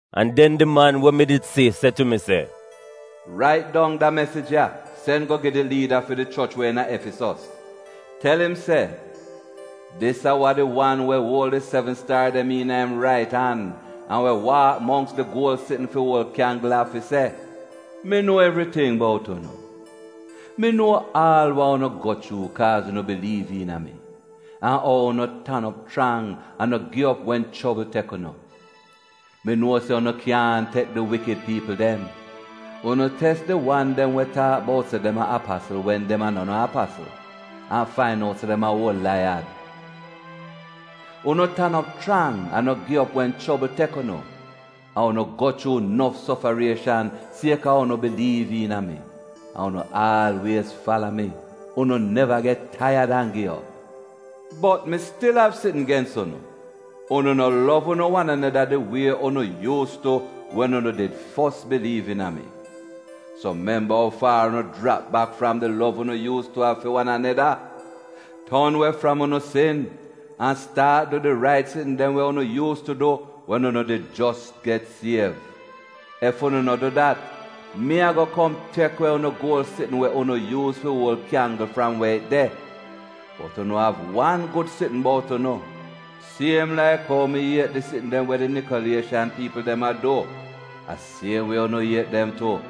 An den di man we mi did si se tu mi se, “Rait dong da mesij ya sen go gi di liida fi di choch we iina Efisos. Tel im se: Dis a wa di wan we uol di sevn staar dem iina im rait an, an we waak mongks di guol sitn fi uol kyanggl av fi se: Mi nuo evriting bout unu. Mi nuo aal wa unu go chuu kaaz unu biliiv iina mi, an ou unu tan op chrang an no gi op wen chobl tek unu. Mi nuo se unu kyaahn tek di wikid piipl dem. Unu tes di wan dem we taak bout se dem a apasl wen dem a no no apasl, an fain out se dem a uol laiyad. Unu tan op chrang an no gi op wen chobl tek unu, an unu go chuu nof sofarieshan siek-a ou unu biliiv iina mi. An unu aalwiez fala mi, unu neva get taiyad an gi op. Bot mi stil av sitn gens unu: unu no lov unu wan aneda di wie unu yuus tu wen unu did fos biliiv iina mi. So memba ou faar unu jrap bak fram di lov unu yuuz tu av fi wan aneda. Ton we fram unu sin an staat du di rait sitn dem we unu yuus tu du wen unu did jos get siev. Ef unu no du dat, mi a-go kom tek we unu guol sitn we unu yuuz fi uol kyanggl fram we it de. Bot unu av wan gud sitn bout unu: siem laik ou mi iet di sitn dem we di Nikolieshan piipl dem a du, a siem wie unu iet dem tu.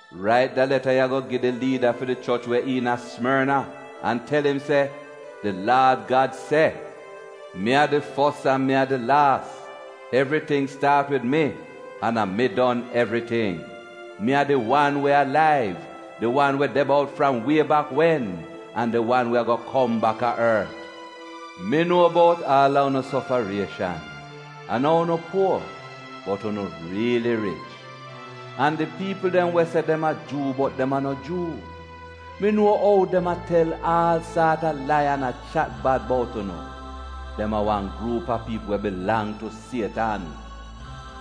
“Rait da leta ya go gi di liida fi di choch we iina Simorna an tel im se: Di Laad Gad se: Mi a di fos an mi a di laas — evriting staat wid mi, an evriting don wid mi. Mi a di wan we alaiv, di wan we de bout fram wie bak wen, an di wan we a-go kom baka ort.” Mi nuo bout aal a unu sofarieshan an ou unu puor — bot unu riili rich. An di piipl dem we se dem a Juu bot dem a no Juu, mi nuo ou dem a tel aal saat a lai an a chat bad bout unu. Dem a wan gruup a piipl we bilang tu Sietan.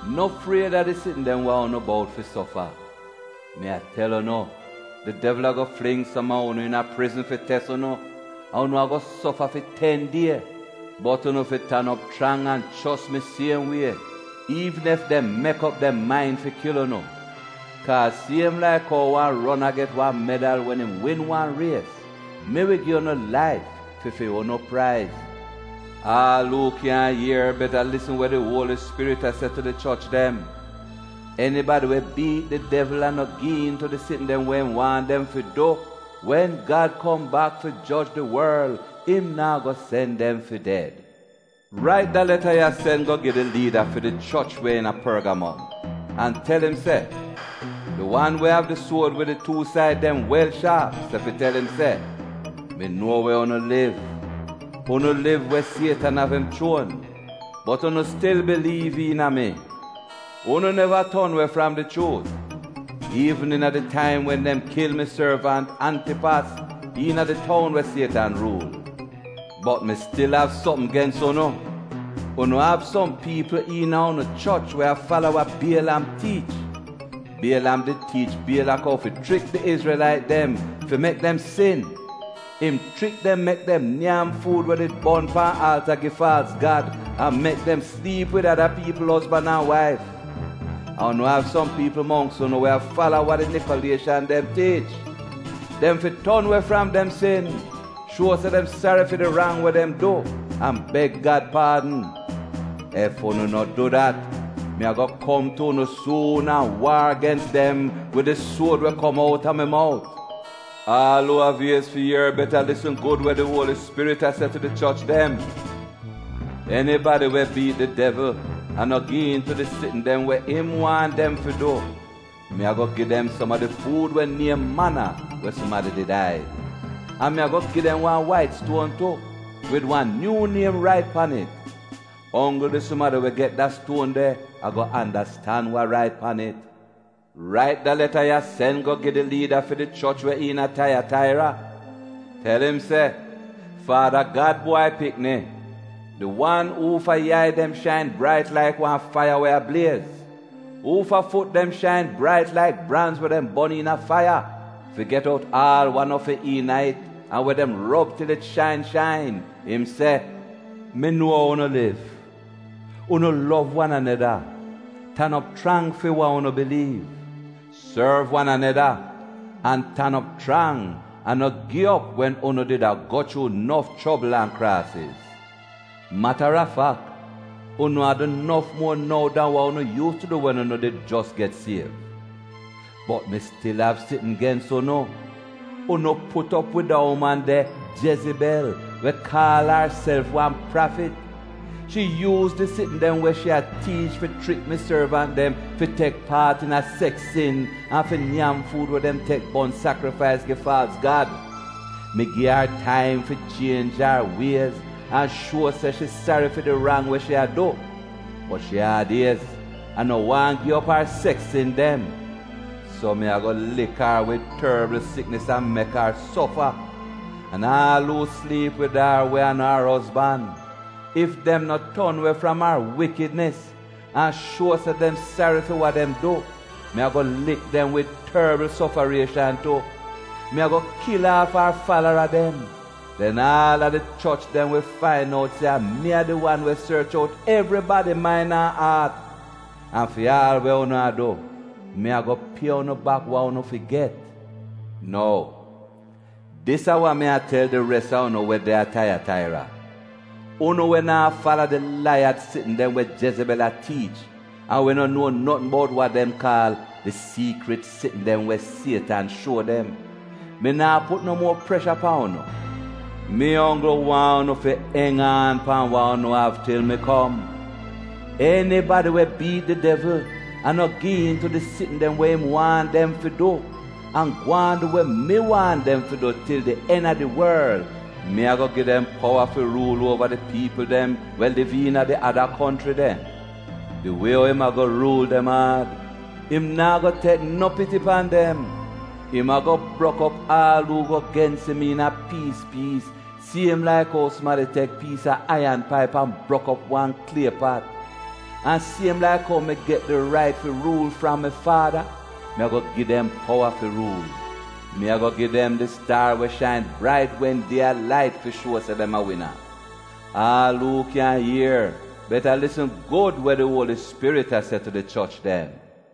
No fried a di sitn dem wa unu bout fi sofa. Mi a tel unu, di devl a-go fling som a unu iina prizn fi tes unu. An unu a-go sofa fi ten die. Bot unu fi tan op chrang an chos mi siem wie, iivn ef dem mek op dem main fi kil unu. Kaaz siem laik ou wan rona get wan medal wen im win wan ries, mi wi gu'unu laif fi fu'unu praiz. Aal uu kyan ier beta lisn we di Uoli Spirit a se tu di choch dem. Enibadi we biit di devl an no gi iin tu di sitn dem wa im waahn dem fi du, wen Gad kom bak fi joj di worl im naa go sen dem fi ded. “Rait da leta ya sen go gi di liida fi di choch we iina Porgamom an tel im se: Di wan we av di suod we di tuu said dem wel shaap se fi tel im se, ‘Mi nuo we unu liv. Unu liv we Sietan av im chuon bot unu stil biliiv iina mi. Unu neva ton we fram di chuut, iivn iina di taim wen dem kil mi sorvant, Antipas, iina di toun we Sietan ruul. Bot mi stil av sopm gens unu. Unu av som piipl iina unu choch we a fala wa Bielam tiich. Bielam did tiich Bielak ou fi chrik di Izrelait dem fi mek dem sin. Im chrik dem mek dem nyam fuud we did bon pan alta gi faalz gad, an mek dem sliip wid ada piipl ozban an waif. An unu av som piipl mongks unu we a fala wa di Nikolieshan dem tiich. Dem fi ton we fram dem sin, shuo se dem sari fi di rang we dem du an beg Gad paadn! Ef unu no du dat, mi a-go kom tu unu suun an waar gens dem wid di suod we kom outa mi mout. Aal uu av iez fi ier beta lisn gud we di Uoli Spirit a se tu di choch dem. Enibadi we biit di devl an no gi'iin tu di sitn dem we im waahn dem fi du, mi a-go gi dem som a di fuud we niem mana we sumadi did aid. An mi a-go gi dem wan wait stuon tu wid wan nyuu niem rait pan it. Onggl di sumadi we get da stuon de a-go andastan wa rait pan it.’ “Rait da leta ya sen go gi di liida fi di choch we iina Taiyataira. Tel im se: Faada Gad Bwai Pikni, di wan uufa yai dem shain brait laik wan faiya we a bliez, uufa fut dem shain brait laik branz we dem bon iina faiya fi get out aal wa no fi iina it an we dem rob til it shain shain, im se, “Mi nuo ou unu liv: unu lov wan aneda, tan op chrang fi wa unu biliiv, sorv wan aneda, an tan op chrang an no gi op wen unu did a go chuu nof chobl an kraasiz. Matarafak, unu a du nof muo nou dan wa unu yuus tu du wen unu did jos get siev. Bot mi stil av sitn gens unu. Unu put op wid da uman de, Jezibel, we kaal arself wan prafit. Shi yuuz di sitn dem we shi a tiich fi chrik mi sorvant dem fi tek paat iina seks sin an fi nyam fuud we dem tek bon sakrifais gi faalz gad. Mi gi ar taim fi chienj ar wiez an fi shuo se shi sari fi di rang we shi a du, bot shi aad-iez an no waahn gi op ar seks sin dem. So mi a-go lik ar wid torbl siknis an mek ar sofa. An aal uu sliip wid ar we a no ar ozban, ef dem no ton we fram ar wikidnis an shuo se dem sari fi wa dem du, mi a-go lik dem wid torbl sofarieshan tu. Mi a-go kil aaf ar falara dem. Den aal a di choch dem wi fain out se a mi a di wan we sorch out evribadi main an aat. An fi aal we unu a du, mi a-go pie unu bak wa unu fi get. Nou dis a wa mi a tel di res a unu we de a Taiyataira, unu we naa fala di laiyad sitn dem we Jezibel a tiich an we no nuo notn bout wa dem kaal di siikrit sitn dem we Sietan shuo dem — mi naa put no muo presha pan unu. Mi onggl waahn unu fi eng aan pan wa unu av til mi kom. Enibadi we biit di devl an no gi iin tu di sitn dem we im waahn dem fi du, an gwaan du we mi waahn dem fi du til di en a di worl, mi a-go gi dem powa fi ruul uova di piipl dem we liv iina di ada konchri dem. ‘Di wie ou im a-go ruul dem aad, im naa go tek no piti pan dem. Im a-go brok op aal uu go gens im iina piis piis siem laik ou sumadi tek piis a aiyan paip an brok op wan klie pat.’ An siem laik ou mi get di rait fi ruul fram mi Faada, mi a-go gi dem powa fi ruul. Mi a-go gi dem di staar we shain brait wen die a lait fi shuo se dem a wina. Aal uu kyan ier beta lisn gud we di Uoli Spirit a se tu di choch dem.”